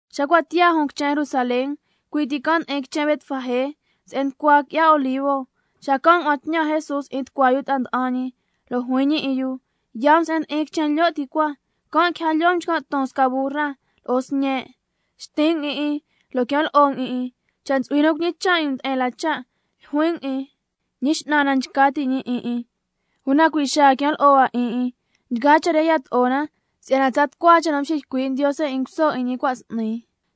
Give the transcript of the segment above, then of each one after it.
Xa cua' tiyaa ti jun quichen Jerusalén, cui' ti can' ndi'in quichen Betfagé se'en nducua qui'ya Olivo, xacan' ngua'an tñan Jesús 'in tucua yu ta'a nda'an ñi. Lo' juin ñi 'in yu: Yaa um se'en ndi'in quichen lyo' ti cua, can' quija lyoo um nchcan' ton sca burra lo'o sñe', xtin' um 'in 'in lo' quian lo'o um 'in 'in. Cha' ntsu'hui nu cuñicha' 'in um nde'en la cha', ljuin um 'in: Ñi X'nan na nchca ti' 'in 'in, una cui' xaa quian lo'o hua 'in 'in. Nchgaa cha' re yato'o na si'yana tsa tucua cha' nu mxiycui' Ndiose 'in nguso 'in ñi cua' s'ni,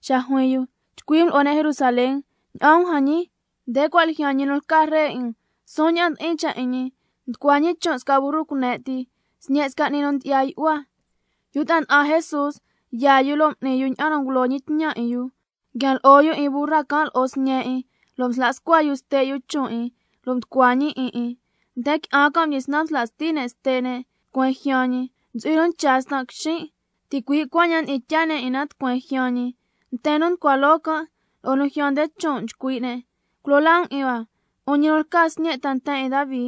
xa juin yu: —Chcui' um lo'o ne' Jerusalén: Ña'an um jan ñi, nde cua' ljyaan ñi nu lca Ree 'in um, suun ña'an ndi'in cha' 'in ñi, nducua ñi chon' sca burru cune' ti, sñe' sca 'ni nu ndyi'ya yu'hua—. Yu ta'a nda'an Jesús yaa yu, lo' m'ni yu ña'an nu ngulo ñi tñan 'in yu. Nguian lo'o yu 'in burra can' lo'o sñe' 'in, lo' msla scua yu ste' yu chon' 'in, lo' mducua ñi 'in 'in. Nten qui'an can' mdyisnan msla sti ne' ste' ne' tucueen ljyaan ñi, ntsu'hui nu ncha stan' quixin', ticui' cuaña'an ndyi'in tyaa ne' 'in na tucueen ljyaan ñi. Nten nu nducua loo can' lo'o nu ljyaan nde chon' nchcui' ne': ¡—Culo laa um 'in hua—, 'un ñi nu lca Sñe' ta nten 'in Davi!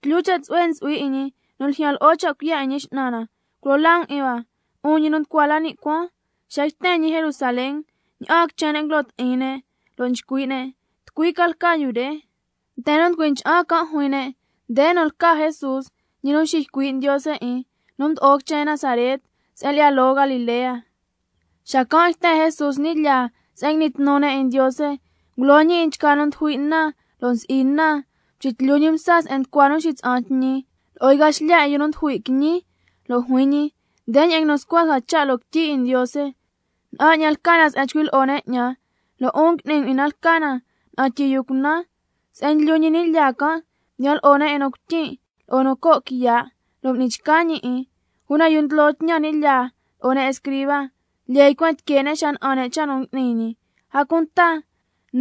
¡—Tlyu cha' tsu'hue ntsu'hui 'in ñi nu ljyaan lo'o cha' cuiya' 'in Ñi X'nan na! ¡Culo laa um 'in hua—, 'un ñi nu nducua la ni' cuaan! Xa yten ñi Jerusalén, ña'aan quichen ne' nguilo ti'in ne', lo' nchcui' ne': ¿Tucui ca lca yu re? Nten nu nducui ncha'an can' juin ne': Nde nu lca Jesús, ñi nu nxiycui' Ndiose 'in, nu mdo'o quichen Nazaret se'en lyi'ya loo Galilea. Xacan' yten Jesús ni' lyaa se'en ngui'ni tnu ne' 'in Ndiose, ngulo ñi 'in nchgaa nu ndyujui' na lo'o nu nsi'i na, mxitlyu ñi msa se'en nducua yu nu nxitsa'an tñi, lo'o yca xlya 'in yu nu ndyujui' quiñi, lo' juin ñi: Ndeña'an nguinu scua sca cha' loo quityi 'in Ndiose: —Na'an 'ñan lca na se'en nchcui' lyi'o ne' 'ñan—, lo' 'un ngui'ni um 'in na lca na —na'an tyi yu cunan—. Se'en ndlyu ñi ni' lyaa can', mdiyan lo'o ne' 'in nu cuityin' lo'o nu co' quiya', lo' m'ni chca ñi 'in. Una yu nu ndlo tñan ni' lyaa lo'o ne' escriba, lyee ycuen tique' ne' xa na'an ne' cha' nu tnu ngui'ni ñi, a cunta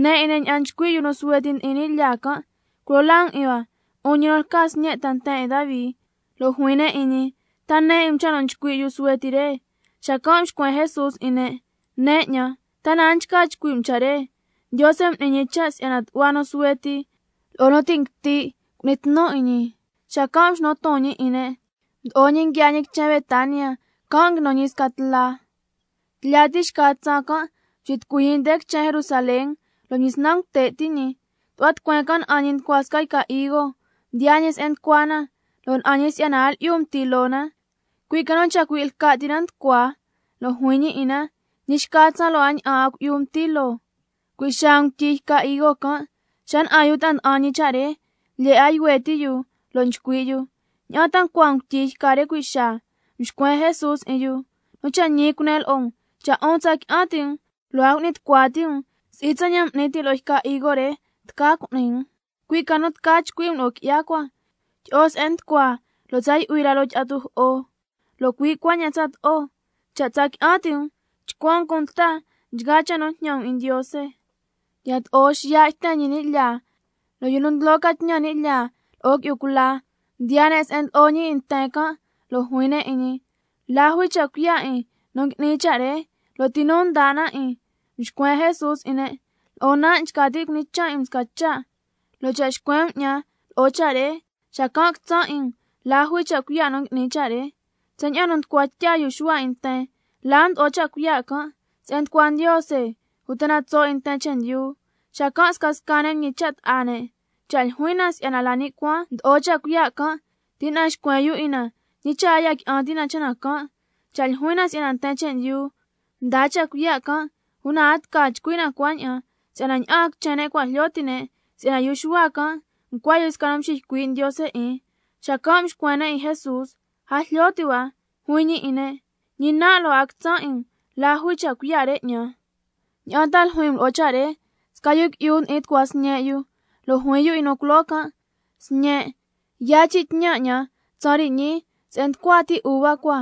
ne 'in ne' ña'an nchcui' yu suhue ti ni' lyaa can': ¡—Culo laa um 'in hua—, 'un ñi nu lca Sñe' ta nten 'in Davi! Lo' juin ne' 'in ñi: ¿Ta ne 'in cha' nu nchcui' yu suhue ti re? Xacan' mxcuen Jesús 'in ne': Nen 'ñan, ¿ta na a nchca chcui' um cha' re: —Ndiose m'ni ñi cha' si'yana tu'hua nu suhue ti lo'o nu ti' nguiti' cu'ni tnu 'in ñi—? Xacan' mxnu ton ñi 'in ne', mdo'o ñi nguiaa ñi quichen Betania, can' nguinu ñi sca tla. Tlya ti xca tsaan can' mxitucui ñi nde quichen Jerusalén, lo' mdyisnan ngute' ti' ñi. Tu'hua tucueen can' na'an ñi nducua sca yca higo, mdiyaa ñi se'en nducua na, lo' na'an ñi si'yana a lyi'yu mti loo na, cui' ca nu chacui' lca' ti na nducua. Lo' juin ñi 'in na: Ñi xca tsaan, lo' a ña'an 'a cui'yu mti loo. Cui' xaa ngutyi yca higo can'. Xa na'an yu ta'a nda'an ñi cha' re, lyee 'a yuhue ti' yu lo' nchcui' yu: ¿Ña'an ta ncua ngutyi yca re cui' xaa? Mxcuen Jesús 'in yu: Nu cha' ñi cunen lo'o um, cha' 'un tsa qui'an ti' um lo' a cu'ni tucua ti' um, si'i tsaña'an m'nin tin lo'o yca higo re tca cu'ni um, cui' ca nu tca chcui' um lo'o qui'ya cua: Tyi'o se'en nducua lo' tsa yu'hui la loo tyi'a tujo'o, lo' cui' cuaña'an tsato'o. Cha' tsa qui'an ti' um, chcuan um cunta nchgaa cha' nu jñan um 'in Ndiose. Yato'o xiya' yten ñi ni' lyaa, lo' yu nu ndlo ca tñan ni' lyaa, lo'o qui'yu cula mdiyaa ne' se'en ndlo'o ñi 'in nten can', lo' juin ne' 'in ñi: ¿La jui cha' cuiya' 'in nu ngui'ni cha' re, lo' ti nu mdaa 'in na 'in? Mxcuen Jesús 'in ne': Lo'on nan' nchca tin' cuñichan' 'in um sca cha', lo' cha' xcuen um 'ñan lo'o cha' re, xacan' quitsan' 'in um la jui cha' cuiya' nu ngui'nin cha' re. Tsaña'an nu mducua tya yu Xuhua 'in nten, ¿la mdo'o cha' cuiya' can'? ¿Se'en nducua Ndiose, uta tso' 'in nten chendyu? Xacan' scasca ne' mñicha' ta'a ne': Cha' ljuin na si'yana la ni' cuaan mdo'o cha' cuiya' can', tina'an xcuen yu 'in na, ñi cha' a ya qui'an ti' na cha' can'. Cha' ljuin na si'yana nten chendyu mdaa cha' cuiya' can', una a tca chcui' na cuaña'an, si'yana ña'aan quichen ne' cua' jlyo ti' ne' si'yana yu Xuhua can' ncua yu sca nu mxiycui' Ndiose 'in. Xacan' mxcuen ne' 'in Jesús: A jlyo ti' hua. Juin ñi 'in ne': Ñi nan' lo' a quitsan' 'in um la jui cha' cuiya' re 'ñan. ¿Ña'an ta ljuin um lo'o cha' re? Sca yu qui'yu ndi'in tucua sñe' yu, lo' juin yu 'in nu culoo can': Sñen', yaa chin' tñan 'ñan tsaan re ñii se'en nducua ti uva cua.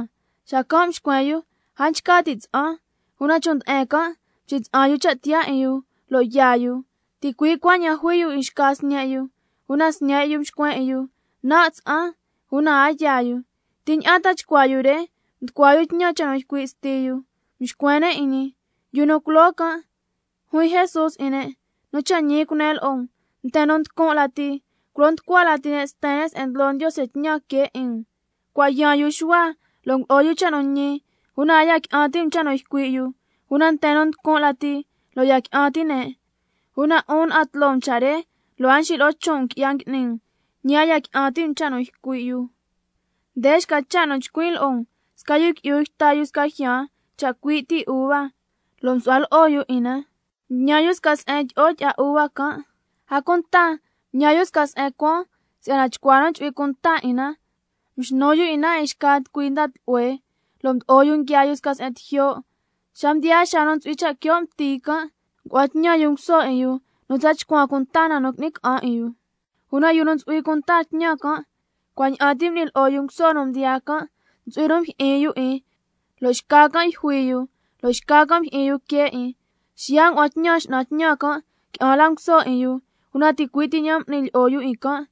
Xacan' mxcuen yu: A nchca tin' tsa'an, una chon' nde'en can' mxitsa'an yu cha' tiyaa 'in yu, lo' yaa yu. Ticui' cuaña'an juin yu 'in xca sñe' yu, una sñe' yu mxcuen 'in yu: Nan' tsa'an. Una a yaa yu. ¿Ti ña'an ta chcuaa yu re mducua yu tñan cha' nu ycui' sti yu? Mxcuen ne' 'in ñi: Yu nu culoo can'. Juin Jesús 'in ne': Nu cha' ñi cunen lo'o um, nten nu nducun' lati, culo nducua lati can' sten se'en ndlo Ndiose tñan que 'in um. Cua' yaan yu Xuhua lo' ngulo'o yu cha' nu ñi, una a ya qui'an ti' um cha' nu ycui' yu, una nten nu nducun' lati, lo' ya qui'an ti' ne', una 'un na'an tloo um cha' re lo' a mxilo'o chon' um qui'ya ngui'ni um, ñi a ya qui'an ti' um cha' nu ycui' yu. Nde xca cha' nu chcuin' lo'o um: Sca yu qui'yu yta yu sca jyaan chacui' ti uva, lo' msu'hua lo'o yu 'in na, mtñan yu sca se'en tyi'o tyi'a uva can', a cunta mtñan yu sca se'en cuaan si'yana chcua nu chu'hui cuan 'in na. Mxnu yu 'in na 'in xca tucui nda tlu'hue, lo' mdo'o yu nguiaa yu sca se'en tijyo'. Xa mdiyaa xaa nu ntsu'hui cha' quio' mti can', ngua'an tñan yu nguso 'in yu nu tsa chcuan cunta na nu qui'ni ca'an 'in yu. Una yu nu ntsu'hui cunta tñan can', cuaña'an ti m'ni yu lo'o nguso nu mdiyaa can', ntsu'hui nu mjyi'in yu 'in, lo' xca can' yjui yu, lo' xca can' mjyi'in yu quee 'in. Xiya' ngua'an tñan x'nan tñan can' qui'an la nguso 'in yu, una ticui' ti ña'an m'ni lyi'o yu 'in can'.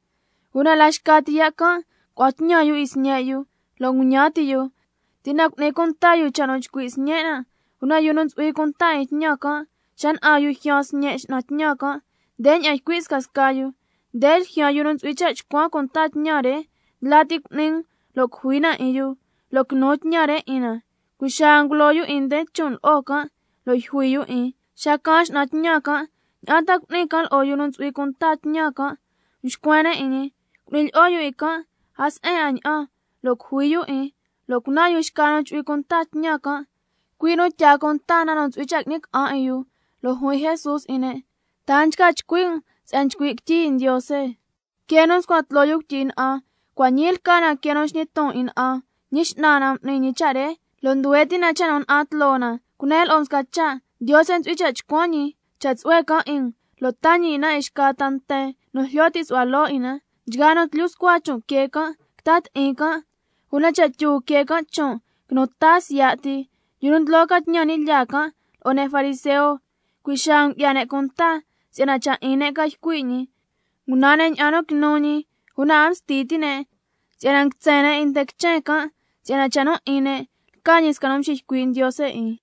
Una la xca ti ya' can' ngua'an tñan yu 'in sñe' yu, lo' ndeña'an nguñan ti' yu: Tina'an cu'ni cunta yu cha' nu chcui' sñen' nan'. Una yu nu ntsu'hui cunta 'in tñan can', xa na'an yu ljyaan sñe' x'nan tñan can', ndeña'an ycui' scasca yu: Nde ljyaan yu nu ntsu'hui cha' chcuan cunta tñan re, ndla ti um lo' cujui na 'in yu, lo' quinu tñan re 'in na. Cui' xaa ngulo yu 'in nde chon' lo'o can', lo' yjui yu 'in. Xa caan x'nan tñan can', ¿ña'an ta cu'ni can' lo'o yu nu ntsu'hui cunta tñan can'? Mxcuen ne' 'in ñi: Cu'ni lyi'o yu 'in can' a se'en 'a ña'an, lo' cujui yu 'in, lo' cunan yu xca nu chu'hui cunta tñan can', cui' nu tyaa cunta na nu ntsu'hui cha' qui'ni ca'an 'in yu. Lo' juin Jesús 'in ne': ¿Ta a nchca chcui' um quityi se'en nguinu scua sca cha': —Quee nu mscuan tloo yu cuityi na'an, cua' ñii lca na quee nu nsñi ton 'in na'an. Ñi X'nan na m'ni ñi cha' re, lo' nduhue ti' na cha' nu na'an tloo na—? Cunen lo'o um sca cha', Ndiose ntsu'hui cha' chcuan ñi cha' tsu'hue can' 'in um, lo' taa ñi 'in na 'in xca ta nten nu jlyo ti' su'hua loo 'in na. Nchgaa nu tlyu scua chon' quee can', quita ti'in can', una cha' tyu quee can' chon', quinu ta can' siya' ti. Yu nu ndlo ca tñan ni' lyaa can' lo'o ne' fariseo, cui' xaa ngu'ya ne' cunta si'yana cha' 'in ne' ca ycui' ñi. Ngunan ne' ña'an nu quinu ñi, una a msti ti' ne' si'yana nguitsen ne' 'in nten quichen can', si'yana cha' nu 'in nten can' lca ñi sca nu nxiycui' Ndiose 'in.